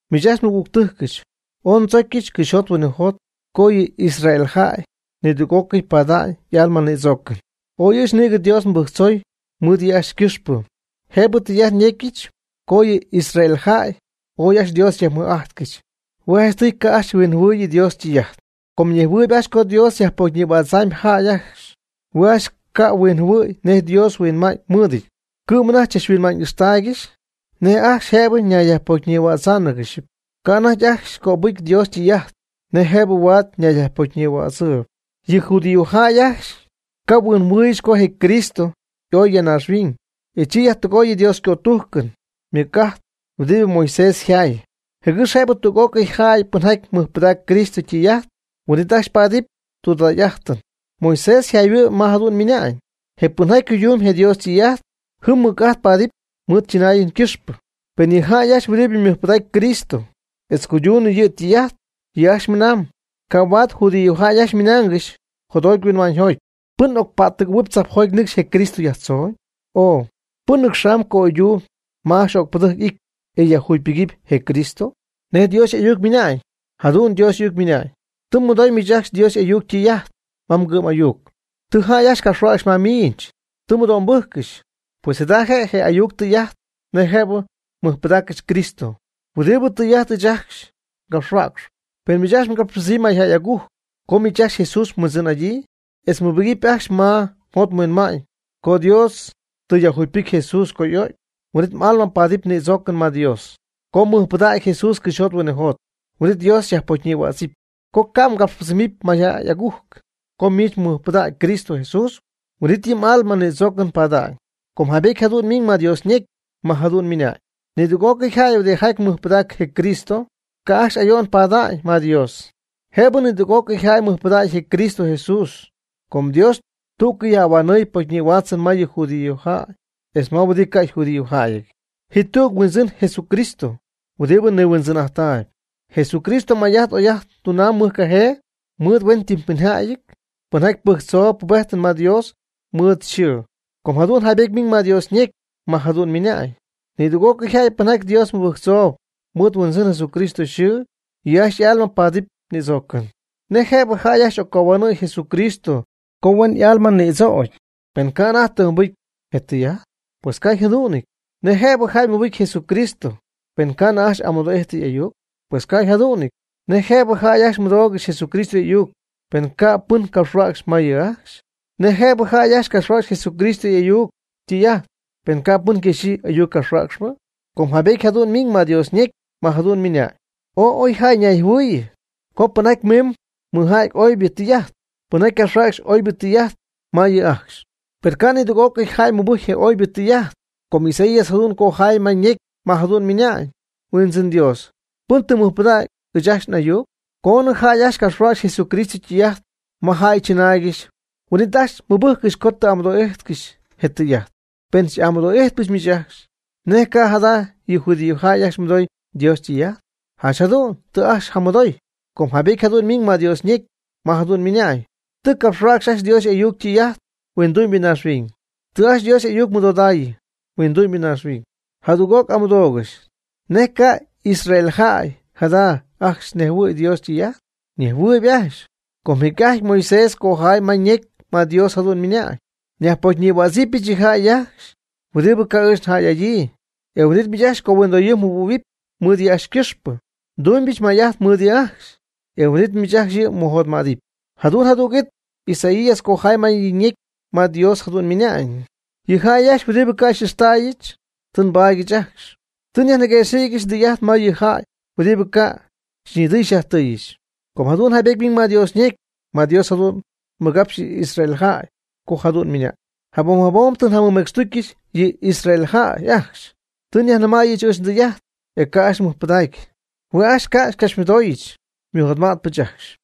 Miich ajcxy nmɨgügtɨjcɨch, ooy ndzocyɨch cɨxyjot huinɨjot co yɨ Israel jäy nidüg'ócɨy pada'ñ y'alma ñïdzoocɨn. Ooy ɨɨch nïgɨ Dios nmɨbɨjctzoy mɨɨd yɨ' ajcxy ycɨxpɨ. Jëbɨ ndɨy'ajt yecyɨch co yɨ Israel jäy ooy ajcxy Dios jayajmɨj'ajtcɨxy. Hue' janchtɨy ca' ajcxy huinjɨhuɨ̈yɨ Dios ytɨy'ajt. Com nejhuɨɨyb ajcxy co Dios yajpocyñïhuädzamyb jäy ajcxy, hue' ajcxy ca' huinjɨhuɨ̈y nej Dios yhuinma'ñ mɨɨdɨty. Cɨ'm anajty chachhuinma'ñ ixtaaygɨxy nej ajcxy jëbɨ ñayyajpocyñïhuädzɨgɨxɨpy. Ca' anajty ajcxy cöbɨcy Dios ytɨy'ajt nej jëbɨ huaad ñayyajpocyñïhuädzɨɨyb. Yɨ judíojäy ajcxy ca' huinjɨhuɨɨygɨxy co je Cristo y'oy ya naaxhuiñ, e chi yajtɨgooyɨ Dios ycötujcɨn ymɨc'ajt huɨdibɨ Moisés yjay, jɨgɨx jëbɨ tüg'ócɨy jäy pɨnjaty mɨjpɨdacp Cristo ytɨy'ajt, huin'it ajcxy paadɨp tudägy'ajtɨn. Moisés yjayhuɨ'm ma jadu'n ymɨna'ñ: “Je pɨnjaty cuydumb je Dios ytɨy'ajt, jɨm mɨc'ajt paadɨpy mɨɨd chɨnaayɨn ycɨxpɨ.” Per yɨ jäy ajcxy huɨdibɨ mɨjpɨdaacp Cristo etz cuydunɨ yɨ' ytɨy'ajt, yɨ' ajcxy ymɨnañ: “Ca' huaad judíojäy ajcxy ymɨnaangɨxy jotjoty huinma'ñyjoty: ¿Pɨn ocpättɨgɨ̈huɨp tzajpjoty nɨcx je Cristo yajtzooñ? o ¿Pɨn nɨcxamb ca'oydactuuby ma ajcxy öcpɨdɨjc y'ity e yajjugypɨgaanɨp je Cristo?” ¿Nej Dios y'ayuc ymɨna'ñ? Jadu'n Dios y'ayuc ymɨna'ñ: “Tɨ mmɨdoy miich ajcxy Dios y'ayuc ytɨy'ajt ma mgɨ'm'ayuc, tɨ jäy ajcxy capxhuäcxy ma miich, tɨ mmɨdo'mbɨjccɨxy.” Pues jada je' je y'ayuc tɨy'ajt nej jëb mɨjpɨdaaccɨxy Cristo, huɨdibɨ tɨy'ajt ɨɨch ajcxy ngapxhuäcxp. Pen miich mgapxypɨdzɨmyb mayjäy agujc co miich ajcxy Jesús mHuindzɨn'adyii, etz mmɨbɨjcpy ajcxy ma mjot mhuinma'ñ co Dios tɨ yajjugypɨjcy Jesús co y'o'cy, huin'it m'alma paadɨp ñïdzoocɨn ma Dios. Co mmɨjpɨdägɨpy Jesús cɨxyjot huinɨjot huin'it Dios xyajpocyñïhuädzɨpy. Co mgapxypɨdzɨmɨpy mayjäy agujc co miich mɨjpɨdägy Cristo Jesús, huin'it yɨ m'alma ñïdzoocɨn pada'ñ. Com jaybety jadu'n miiñ ma Dios ñecy, ma jadu'n ymɨnañ: “Nidüg'ocɨy jäy huɨdijaty mɨjpɨdacp je Cristo, ca' ajcxy ayo'n pada'ñ ma Dios.” Jëbɨ nidüg'ócɨy jäy mɨjpɨdägy je Cristo Jesús com Dios tú'cɨy yajhuinhuanɨɨy pocyñïhuaatzɨn ma yɨ judíojäy etz ma huɨdi ca' yjudíojäyɨty. Ji tüg Huindzɨn je Jesucristo huɨdibɨ niHuindzɨn'ajttaayb. Jesucristo may'ajt oy'ajt tunam mɨjcajee mɨɨd huentɨmpɨnjäyɨty pɨnjaty pɨjczoob pubejtɨn ma Dios mɨɨd yɨ' yxɨɨ. Com jadu'n jaybety ymiiñ ma Dios ñecy, ma jadu'n ymɨna'ñ: “Nidüg'ócɨy jäy pɨnjaty Dios mɨbɨjctzoob mɨɨd Huindzɨn Jesucristo yxɨɨ, yɨ' ajcxy y'alma paadɨp ñïdzoocɨn.” ¿Nej jëbɨ jäy ajcxy occohuanɨ̈y Jesucristo co huen y'alma nïdzögy, pen ca' anajty tɨ mɨbɨjcɨ je ytɨy'ajt? Pues ca' yjadu'nɨty. ¿Nej jëbɨ jäy mɨbɨcy Jesucristo penɨ ca'nɨ ajcxy amɨdo'ijtɨ y'ayuc? Pues ca' yjadu'nɨty. ¿Nej jëbɨ jäy ajcxy mɨdoogɨxy Jesucristo y'ayuc, pen ca' pɨn capxhuäcxy ma yɨ' ajcxy? ¿Nej jëbɨ jäy ajcxy capxhuäcxy Jesucristo y'ayuc ytɨy'ajt, pen ca' pɨn yquexyii ayuccapxhuäcxpɨ? Com jaybety jadu'n ymiiñ ma Dios ñecy, ma jadu'n ymɨnañ: “Ooy oy jäy ñayjɨhuɨ̈yii co pɨnjaty mɨmimb mɨja'tp oybɨ tɨy'ajt, pɨnjaty capxhuäcxp oybɨ tɨy'ajt ma yɨ' ajcxy.” Per ca' nidüg'ócɨy jäy mɨbɨcy je oybɨ tɨy'ajt, com Isaías jadu'n cojay ma ñecy ma jadu'n ymɨnañ: “Huindzɨn Dios, ¿pɨn tɨ mɨjpɨdägy ɨɨch ajcxy n'ayuc?” Coonɨ jäy ajcxy capxhuäcxy Jesucristo ytɨy'ajt ma jäy chɨnaaygɨxy, huin'it ajcxy ymɨbɨjccɨxy com tɨ amɨdo'ijtcɨxy je tɨy'ajt. Per n'amɨdooybɨch miich ajcxy: ¿Nej ca' jada' yɨ judíojäy ajcxy mɨdoy Dios ytɨy'ajt? Janch jadu'n tɨ ajcxy jamɨdoy, com jaybety jadu'n ymiñ ma Dios ñecy ma jadu'n ymɨnañ: Tɨ capxhuäcxy ajcxy Dios y'ayuc ytɨy'ajt huindu'mybɨ naaxhuiñ. Tɨ ajcxy Dios y'ayuc mɨdodaayɨ huindu'mybɨ naaxhuiñ. Jadüg'oc n'amɨdoogɨxy: ¿Nej ca' Israel jäy jada' ajcxy nejhuɨ̈y Dios ytɨy'ajt? Ñejhuɨɨyb ajcxy. Com jecy'ajty Moisés ycojay ma ñecy ma Dios jadu'n ymɨnañ: Nyajpocyñïhuaatztähuɨbyɨch yɨ jäy ajcxy huɨdibɨ ca' ɨɨch njäy'adyii, e huin'it miich ajcxy cohuindoyɨɨ mjɨhuɨ̈huɨpy mɨɨd yɨ' ajcxy ycɨxpɨ. Ndunɨpyɨch may'ajt mɨɨd yɨ' ajcxy, e huin'it miich yɨ' ajcxy mmɨjotmädɨp. Jadu'n jadüg'it Isaías cojay ma yɨ' ñecy, ma Dios jadu'n ymɨnañ: Yɨ jäy ajcxy huɨdibɨ ca' xy'ixtäyɨch, tɨ xypaadyɨch ajcxy. Tɨ nyajniguëxɨ̈gyɨch ndɨy'ajt ma yɨ jäy huɨdibɨ ca' xyñidɨy xyajtɨɨyɨch. Com jadu'n jaybety ymiñ ma Dios ñecy, ma Dios jadu'n nigapxy yɨ Israel jäy co jadu'n ymɨnañ: Jabom jabom tɨ njamɨmecxtucyɨch yɨ Israel jäy ajcxy. Tɨ njayajnɨmäyɨch ɨɨch ndɨy'ajt, e ca' ajcxy mɨjpɨdägy. Hue' ajcxy ca' xycapxymɨdooyɨch, xymɨjotmɨj'öcpɨch ajcxy.